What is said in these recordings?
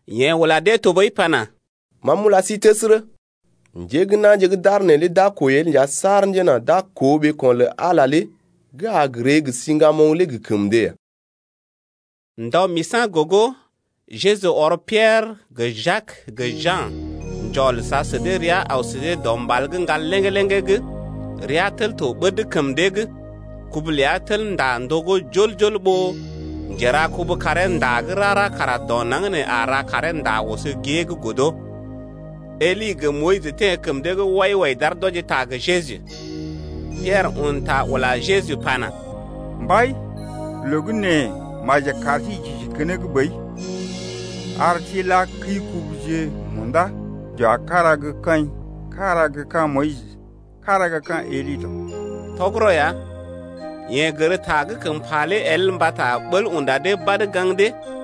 Yeḛ ula dee tɔɓəi pana: Ma m’ula sí təsərə, njé gə́ na̰je gə́ d’aar neelé d’a kwəi el nja saar njena d’a koo ɓeeko̰ lə Ala gə́ a ree gə siŋgamoŋ lé gə kəm dee ya. Ndɔ misa̰ gogo, Jeju ɔr Piɛrə gə Jak gə Ja̰ njɔl sa sə dee rəa aw sə dee dɔ mbal gə́ ŋgal léŋgé-léŋgé’g. Rea tel to ɓəd kəm dee’g. Kubu ləa tel ndá ndogó jol-jol ɓó njerakubu karee ndá gə́ rara kara dɔ naŋg nee a ra karee ndá oso gée’g godo. Eli gə Moyis teḛ kəm dee’g wai-wai d’aar d’wɔji ta gə Jeju. Piɛrə un ta ula Jeju pana: Mbai, loo gə́ nee maji kar sí j’isi keneŋ ɓəi, ar sí n’la kəi-kubuje munda j’wa kára gə́ kaḭ, kára gə́ ka̰ Moyis, kára gə́ ka̰ Eli tɔ. Tɔgərɔ ya, yeḛ gər ta gə́ kəm pa lé el mbata ɓəl unda dee badə gaŋg dee.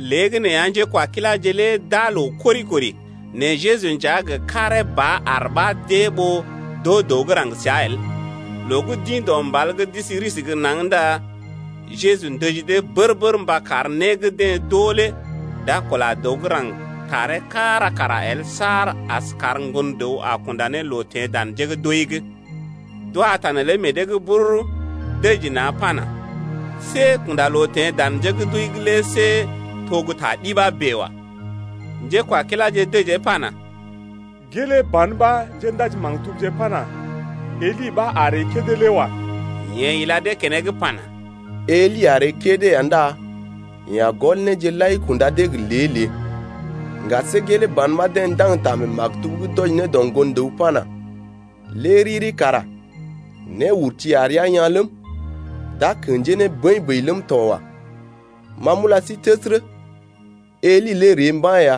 Léegəneeya njékwakiláje lé d’aa loo kori-kori, nɛ Jeju nja gə karee ba aar ɓa d’ée ɓó d’oo dəw gə́ raŋg səa el. Loo gə́ d’ḭ dɔ mbal’g d’isi risi gə́ naŋg ndá Jeju ndəji dee bər-bər mba kar né gə́ deḛ d’oo lé d’a kula dəw gə́ raŋg taree kára kara el saar as kar Ŋgon-dəw a kunda ne loo teḛ ne dan njé gə́ d’wəi’g. D’wa ta neelé meḛ dee’g bururu, dəji na̰ pana: See kunda loo teḛ dan njé gə́ d’wəi’g lé see to gə́ ta ɗi ɓa bèe wa. Njékwakiláje dəjee pana: Gelee ban ɓa njéndaji-maktubje pana: Eli ɓa a ree kédé lé wa. Yeḛ ila dee keneŋ pana: Eli a ree kédé ya ndá yeḛ a gɔl néje lai kunda dee gə lée-lée. Ŋga see gelee ban ɓa deḛ ndaŋg ta mee maktub’g d’wɔji ne dɔ Ŋgon-dəw pana: Lé riri kara néurti a rəa yaa̰ ləm, d’a kḛjee ne bəḭ-bəḭ ləm tɔ wa. Ma m’ula sí təsərə, Eli lé ree mba̰ ya,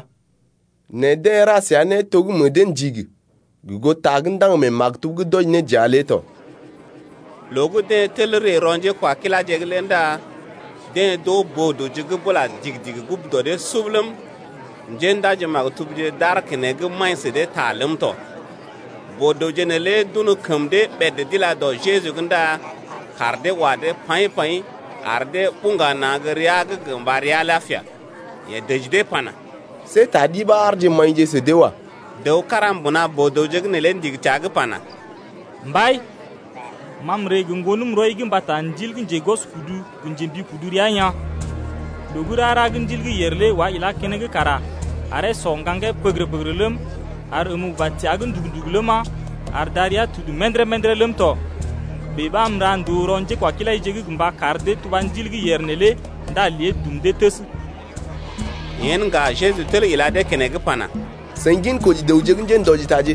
nɛ deḛ ra səa né to gə́ meḛ dee ndigi gə goo ta gə́ ndaŋg mee maktub’g d’wɔji ne dəa lé tɔ. Loo gə́ deḛ tel ree rɔ njékwakiláje’g lé ndá deḛ d’oo boo-dəwje gə́ bula digi-digi gugu dɔ dee sub ləm, njéndaji-maktubje d’aar keneŋ maḭ sə dee ta ləm tɔ. Boo-dəwje neelé d’un kəm dee ɓèd d’ila dɔ Jeju’g ndá kaar dee wa dee paḭ-paḭ, ar dee buŋga na̰ gə́ rəa’g gə mba rəa lapia. Yeḛ dəji dee pana: See ta ɗi ɓa aarje maḭje sə dee wa. Dəw kára mbuna boo-dəwje’g neelé ndigi təa’g pana: Mbai, ma m’ree gə ŋgonəm rɔi’g mbata ndil gə́ njegwɔskudu gə njembikudu rəa yaa̰. Loo gə́ rara gə́ ndil gə́ yèr lé wá ilá keneŋ kara aree sɔ ŋgaŋgee pəgərə-pəgərə ləm, ar əm uba təa’g ndugu-ndugu ləma, ar darəa tudu mə̰dərə-mə̰dərə ləm tɔ. Bèe ɓa m’ra ndòo rɔ njékwakilaije’g gə mba kar dee tuba ndil gə́ yèr neelé ndá lée dum dee təs. Yen ŋga Jeju tel ila dee keneŋ pana: Seḭ ginkoji dəwje gə́ njéndɔjitaje,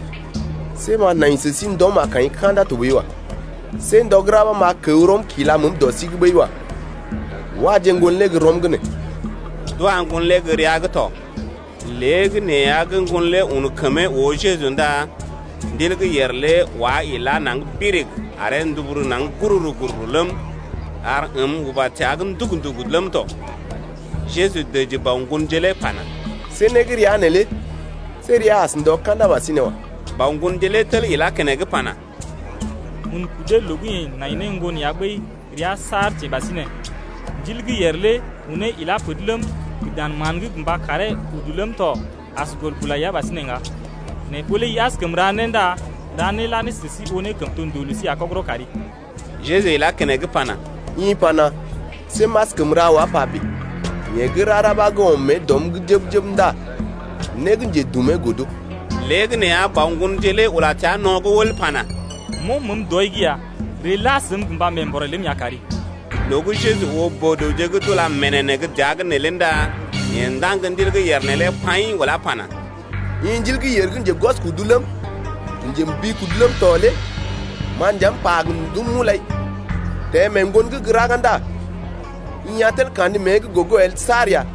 see m’a nai sə sí ndɔm ka̰da tɔɓəi wa. See ndɔ gə́ ra ɓa m’a kəw rɔm kila məəm dɔ sí’g ɓəi wa. Waje ŋgon lé gə́ rɔm’g nee. D’wa ŋgon lé gə́ rəa’g tɔ. Léegəneeya gə́ ŋgon lé un kəmee oo Jeju ndá ndil gə́ yèr lé wá ilá naŋg birig aree nduburu naŋg gururu-gururu ləm, ar əm uba təa’g ndugu-ndugu ləm tɔ. Jeju dəji bɔ ŋgonje lé pana: See né gə́ rəa neelé see rəa as ndɔ ka̰da ɓasinè wa. Bɔ ŋgonje lé tel ilá keneŋ pana: Un kudee loo gə́ yeḛ nai ne ŋgon ya ɓəi rəa saar teḛ ɓasinè. Ndil gə́ yèr lé unee ilá per’d ləm, gə dan mán’g gə mba karee udu ləm tɔ, as gɔl bula ya ɓasinè ŋga. Nɛ ɓó lé i askəm ra né ndá ra né la ne sə sí oo ne kəm to ndòo lə sí ya kɔgərɔ kari. Jeju ilá keneŋ pana: I pana: See m’askəm ra wa pa bèe. Yeḛ gə́ rara ɓa gə́ ɔm mée dɔm’g jəb-jəb ndá né gə́ njedumee godo. Léegəneeya bɔ ŋgonje lé ula təa no̰’g wəl pana: M’ɔm meḛ dɔi’g ya! Ree la səm gə mba mee-mbɔrè ləm ya kari. Loo gə́ Jeju oo boo-dəwje gə́ d’ula ménénḛ́ gə́ dəa’g neelé ndá yeḛ ndaŋg ndil gə́ yèr neelé paḭ, ulá pana: I ndil gə́ yèr gə́ njegwɔskudu ləm, gə njembikudu ləm tɔ lé ma nja m’pa gə ndum m’ulai, teḛ mee ŋgon’g gə́ raga ndá i a tel kandə mée’g gogo el saar ya.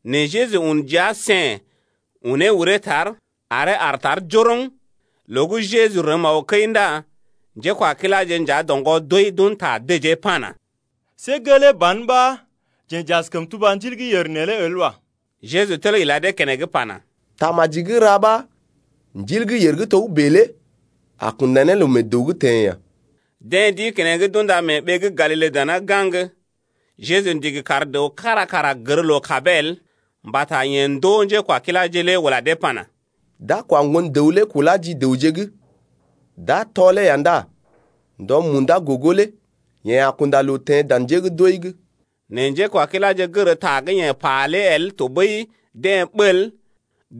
Nɛ Jeju un jia sèn, unee uree tar, aree aar tar njoroŋ. Loo gə́ Jeju rəm aw kəi ndá njékwakiláje nja doŋgɔ doi d’un ta dəjee pana: See gelee ban ɓa jeḛ j’askəm tuba ndil gə́ yèr neelé el wa. Jeju tel ila dee keneŋ pana: Tamaji gə́ ra ɓa ndil gə́ yèr gə́ togə́bè lé a kunda ne loo mee dəw’g teḛ ya. Deḛ d’ḭ keneŋ d’unda mee ɓee gə́ Galile dana gaŋg. Jeju ndigi kar dəw kára kara gər loo-kabee el. Mbata yeḛ ndoo njékwakiláje lé ula dee pana: D’a kwa Ŋgon-dəw lé kulá ji dəwje’g, d’a tɔlee ya ndá ndɔ munda gogo lé yeḛ a kunda loo teḛ dan njé gə́ d’wəi’g. Nɛ njékwakiláje gər ta gə́ yeḛ pa lé el tɔɓəi deḛ ɓəl,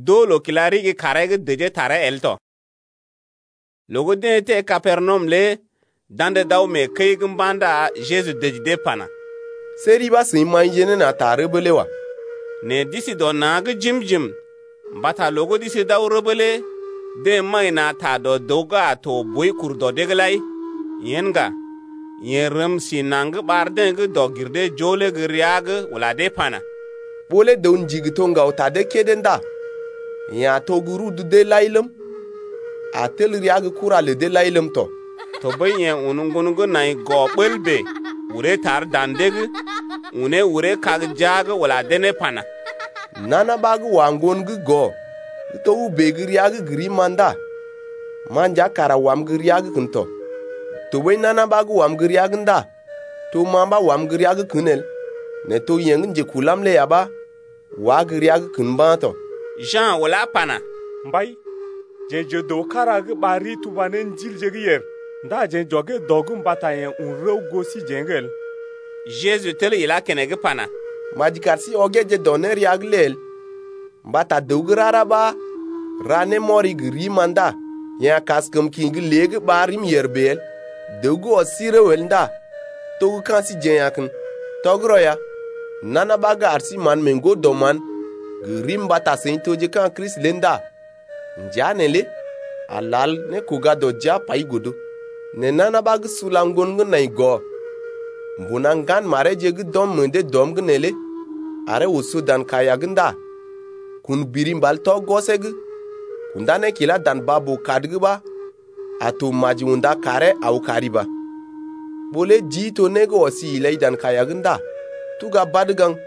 d’oo loo kila ɗigi kaaree’g dəjee taree el tɔ. Loo gə́ deḛ teḛ Kapernawum lé d’andə d’aw mee kəi’g mba̰ ndá Jeju dəji dee pana: See ri ɓa seḭ maḭje ne na̰ ta rəbee lé wa. Nɛ d’isi dɔ na̰’g jim-jim mbata loo gə́ d’isi d’aw rəbə lé deḛ maḭ na̰ ta dɔ dəw gə́ a to boi kur dɔ dee’g lai. Yen ŋga, yeḛ rəm si naŋg ɓar deḛ gə́ dɔg-gir-dee-joo lé gə́ rəa’g, ula dee pana: Ɓó lé dəw ndigi to ŋgaw ta dee kédé ndá yeḛ a to gə́ rudu lə deḛ lai ləm, a tel rəa gə́ kura lə deḛ lai ləm tɔ. Tɔɓəi yeḛ un ŋgon gə́ nai gɔ ɓəl bèe, uree tar dan dee’g, unee uree kag jia’g ula dee ne pana: Nana ɓa gə́ wa ŋgon gə́ nai gɔ gə́ togə́bè gə́ rəa’g gə rim-ma ndá ma nja kara wam gə́ rəa’g kən tɔ. Tɔɓəi nana ɓa gə́ wam gə́ rəa’g ndá to ma ɓa wam gə́ rəa’g kən el nɛ to yeḛ gə́ njekulam lé ya ɓa wá gə́ rəa’g kən mba̰ tɔ. Ja̰ ulá pana: Mbai, jeḛ j’oo dəw kára gə́ ɓar rii ɓa tuba ne ndilje gə́ yèr, ndá jeḛ j’ɔgee dɔ’g mbata yeḛ un rəw goo síjeḛ’g el. Jeju tel ilá keneŋ pana: Maji kar sí ɔgeeje dɔ nérea’g lé el, mbata dəw gə́ rara ɓa ra né némɔri gə rim ndá yeḛ a kaskəm kḭ gə́ lée’g ɓar rim yèr bèe el. Dəw gə́ ɔs sí rəw el ndá to gə́ ka̰ síjeḛ ya kən. Tɔgərɔ ya, nana ɓa gə́ ar sí mán mee ŋgo-dɔ-mán gə rim mbata seḭ toje ka̰ Kristi lé ndá njea neelé a lal nékoga-dɔ-jia pai godo. Nɛ nana ɓa gə́ sula ŋgon gə́ nai gɔ mbuna ŋgan mareeje gə́ d’ɔm meḛ dee dɔm’g neelé aree oso dan kaiya’g ndá kun biri mbal tɔ gwɔsee’g kundá ne kilá dan baa-boo-kad’g ɓa a to maji unda karee aw kari ba. Ɓó lé jii to né gə́ ɔsi ilai dan kaiya’g ndá tuga badə gaŋg.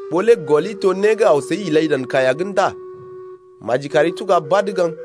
Ɓó lé gɔli to né gə́ aw səi ilai dan kaiya’g ndá maji kari tuga badə gaŋg.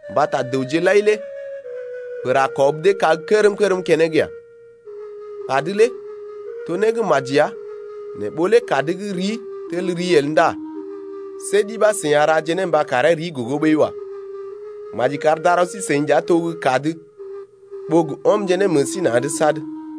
Mbata dəwje lai lé pər a kɔb dee kág kərm-kərm keneŋ ya. Kad lé to né gə́ maji ya, nɛ ɓó lé kad gə́ rii tel rii el ndá see ɗi ɓa seḭ a raje ne mba karee rii gogo ɓəi wa. Maji kar darɔ sí-seḭ nja to gə́ kad ɓó gə́ ɔmje ne meḛ sí na̰’d sad.